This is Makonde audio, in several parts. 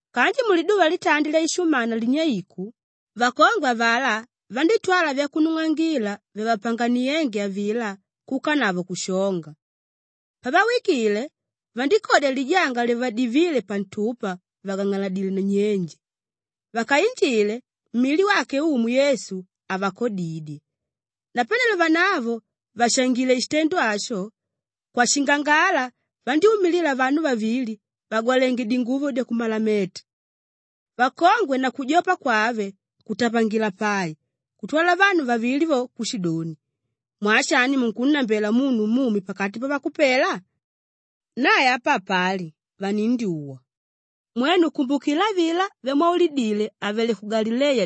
Kanji muliduva litandi lyaishumana linyeiku, vakongwe avalá vandítwala vyakunung'angila vyavapanganiénge avilá kuukanavo kushonga. Pavawikile, vandíkodya lijanga lyavadivíle pantupa vàgang'aladile nnyenje. Vakainjile, mili wake Umu Yesu, havakodidye. Napanelo vanavo vàshangile shitendo asho, kwashingangala vandyúmilila vanu vavili vagwalenge dinguvo dyakumalameta. Vakongwe na kujopa kwave kutapangila pai kutwala vanu vavili vo kushidoni, “Mwaa shani munkunnambela munu mumi pakati pavakupela? Nae apa hapali, vanindyuwa. Mwenu kumbukila avilá vyamwaulidíle àvele ku Galileya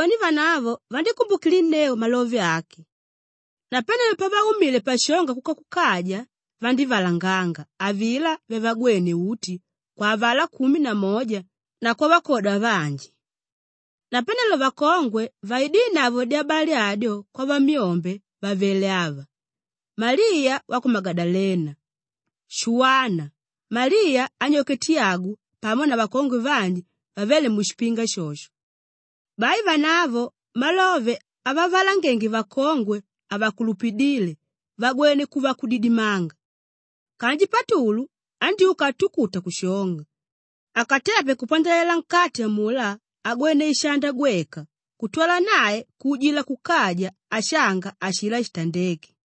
Nadoni vanavo vandíkumbukilinneu malove ake. Napanelo pavaumile pashonga kuka kukaja, vandívalanganga avilá vyavagwéne uti kwa avalá kumi na moja na kwavakwoda vanji. Napanelo vakongwe vaidínavo dyabali adyo kwavamyombe vavele ava: Maliya wa ku Magadalena, Shuwana, Maliya anyoke Tiyagu pamo na vakongwe vanji vavéle mushipinga shosho. Bai vanavo malove avavalangenge vakongwe havakulupidíle vagwene kuva akudidimanga. Kanji Patulu andyúka atukuta kushonga; akatepe kupandalela nkati amulá agwene ishanda gweka kutwala nae kuujila kukaja ashanga ashilá shitandéke.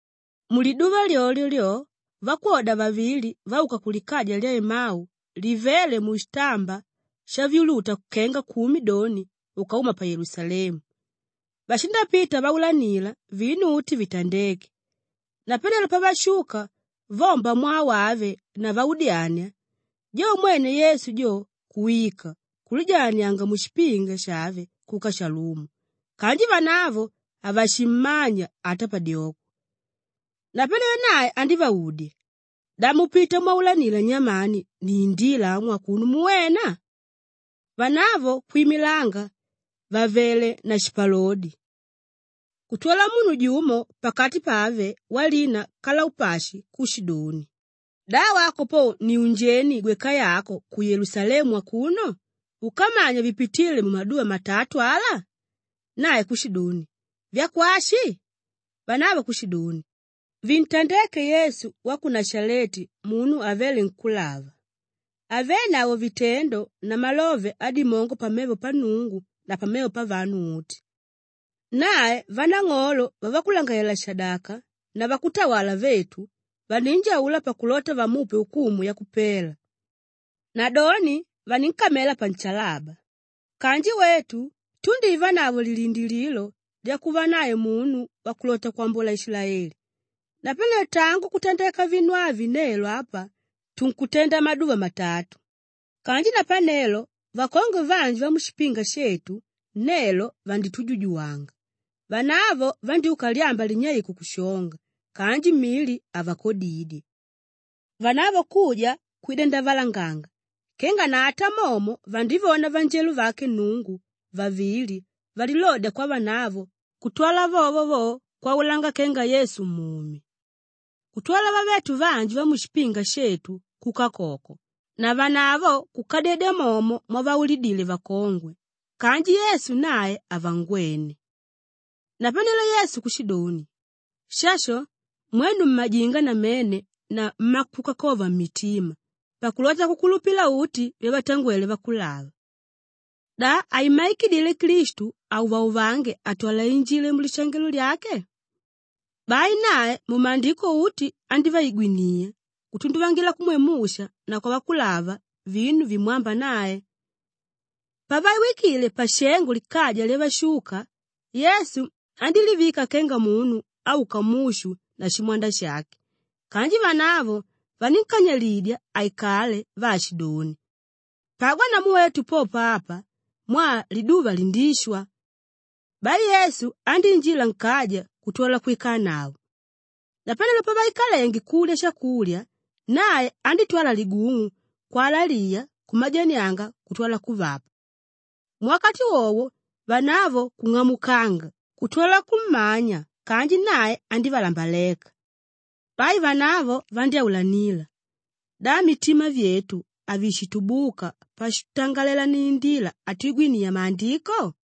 Muliduva lyolyo lyo, vakwoda vavili vauka kulikaja lya Emau livéle mushitamba shavyuluta kenga kumi doni ukauma pa Yelusalemu, vashindapita vaulanila vinu uti vitandéke. Napanelo pavashuka vomba mwaa wave na vaudyania, jo mwene Yesu jo kuwika kulijalanianga mushipinga shave kuka shalumo kanji vanavo havashimmanya ata padyoko. Napanelo nae andívaudya, “Da mupita mwaulanila nyamani niindila amu akuno muwena?” Vanavo kwimilanga vàvele na shipalodi. Kutwala munu jumo pakati pave walina Kalaupashi kushidoni, “Da wako po ni unjeni gweka yako ku Yelusalemu akuno úkamanya vipitíle mumaduva matatu ala?” Nae kushidoni, “Vyakwashi?” Vanavo kushidoni, “Vintandéke Yesu wa ku Nashaleti munu avéle nkúlava, avénavo vitendo na malove adimongo pamevo pa Nnungu na pamevo pavanu uti. Nae vanang'olo vavakulangalalela-shadaka na vakutawala vetu vaninjaula pakulota vamupe ukumu yakupela; nadoni, vaninkamela panshalaba. Kanji wetu tundívanavo lilindilililo lyakuva nae munu wakulota kwambola Ishilaeli; napanelo tangu kutandeka vinu avi nelo apa tunkutenda maduva matatu. Kanji napanelo, vakongwe vanji vamushipinga shetu nelo vanditujujuwanga. Vanavo vandyúka lyamba linyeiku kushonga kanji mili havakodidye. Vanavo kuja kwida ndavalanganga kenga na ata momo vandívona vanjelo vake Nnungu vavili valilodya kwavanavo kutwala vovo vo kwaulanga kenga Yesu mumi. Kutwala vavetu vanji vamushipinga shetu kuka koko, navanavo kukadyedya momo mwavaulidile vakongwe kanji Yesu nae havangwene.” Napanelo Yesu kushidoni, “Shasho! Mwenu mmajinga namene na mmakukakova mmitima pakulota kukulupila uti vyavatangwele vakulava! Da haimmaikidile Klistu auvauvange atwale ainjile mulishangelo lyake?” Bai nae mumaandiko uti andíviigwiniya kutunduvangila kumwe Musha na kwavakulava vinu vimwámba nae. Pavawikile pashengo likaja lyavashuka, Yesu andílivika kenga munu áuka mushu na shimwanda shake kanji vanavo vanínkanyilidya aikale vaashidoni, “Pagwa namu wetu popo apa mwaa liduva lindishwa.” Bai Yesu andíinjila nkaja kutwala kwikanavo. Napanelo pavaikalenge kulya shakulya, nae andítwala ligung'u kwalaliya kumajanianga kutwala kuvapa. Muwakati wowo vanavo kung'amukanga kutwala kummanya kanji nae andívalambaleka. Bai vanavo vandyáulanila, “Da mitima vyetu havishitubuka pashitutangalela niindila atwigwiniya Maandiko?”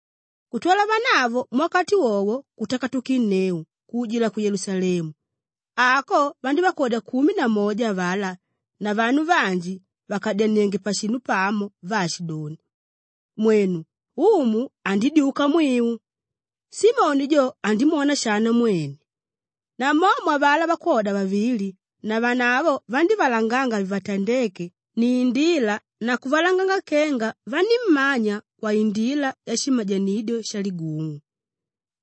Kutwala vanavo muwakati wowo kutakatukanginneu kuujila ku Yelusalemu; ako vandívakodya kumi na moja avalá na vanu vanji vàkadyanienge pashinu pamo vaashidoni, “Mwenu, Umu andidyuka mwiu! Simoni jo andimwona shana mwene.” Namomo avalá vakwoda vavili, navanavo vandívalanganga vivatandéke niindila na kuvalanganga kenga vanímmanya kwaindila yashimajanidyo shaligung'u.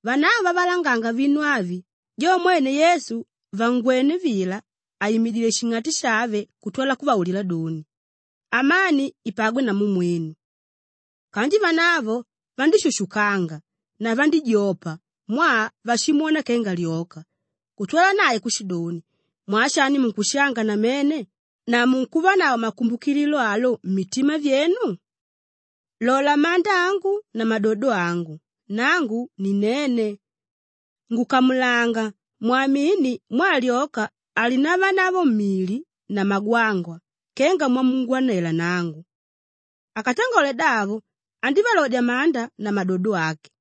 Vanavo vavalanganga vinu avi, jo mwene Yesu vangwené vila àimidile shing'ati shave kutwala kuvaulila doni, “Amani ipagwe namu mwenu.” Kanji vanavo vandíshushukanga na vandíjopa mwaa vashimwona kenga lyoka kutwala nae kushidoni, “Mwaa shani munkushanga namene na munkuvanavo makumbukililo alo mmitima vyenu? Lola manda angu na madodo angu; nangu ninene. Ngukamulanga mwamini mwaa lyoka halinavanavo mili na magwangwa kenga mwamungwanela nangu.” Akatangole davo, andívalodya manda na madodo ake.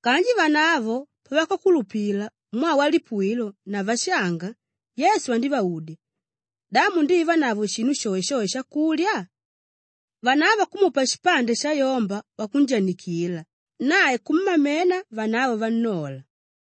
Kanji vanavo pavakakulupila mwaa walipuwilo na vashanga, Yesu andívaudya, “Da mundivanavo shinu shoeshoe shakulya?” Vanavo kumupa shipande shayomba wakunjanikila nae kumamena vanavo vannola.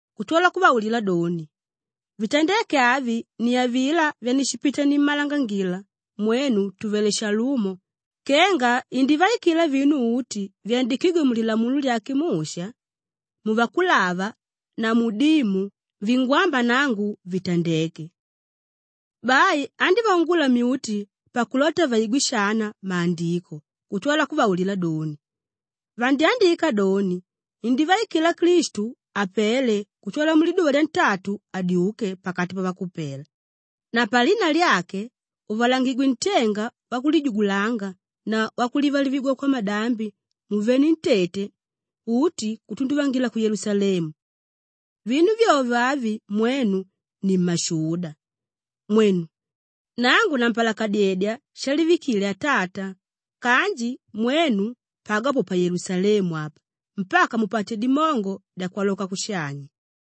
Kutwala kuvaulila doni, “Vitandéke avi ni avilá vyanishipita nimmalangangila mwenu tùvele shalumo kenga indivaikila vinu uti vyandikígwe mu Lilamulo lyake Musha, mu Vakulava na mu Dimu vingwámba nangu, vitandeke.” Bai andívaungula myuti pakulota vaigwe shana Maandiko kutwala kuvaulila doni, “Vandyandika doni, indivaikila Klistu apele kutwala muliduva lyantatu adyuke pakati pavakupela na palina lyake, uvalangangigwe ntenga wakulijugulanga na wakulivalivigwa kwamadambi muvenentete uti kutunduvangila ku Yelusalemu. Vinu vyovyo avi mwenu ni mmashuda. Mwenu! Nangu nampalakadyedya shalivikile Atata kanji mwenu pagwa po pa Yelusalemu apa mpaka mupate dimongo dyakwaloka kushanya.”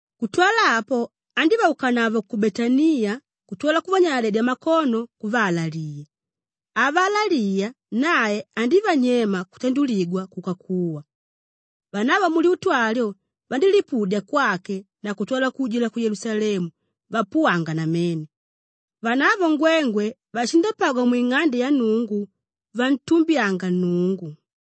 Kutwala apo andívaukanavo ku Betaniya kutwala kuvanyaladyedya makono kuvaalaliya. Avaalaliya nae andívanyema kutanduligwa kuka kuwa. Vanavo mulyutu alyo vandílipudya kwake nae kutwala kuujila ku Yelusalemu vapuwanga namene. Vanavo ngwengwe vashindapagwa mwing'ande ya Nnungu vantumbyanga Nnungu.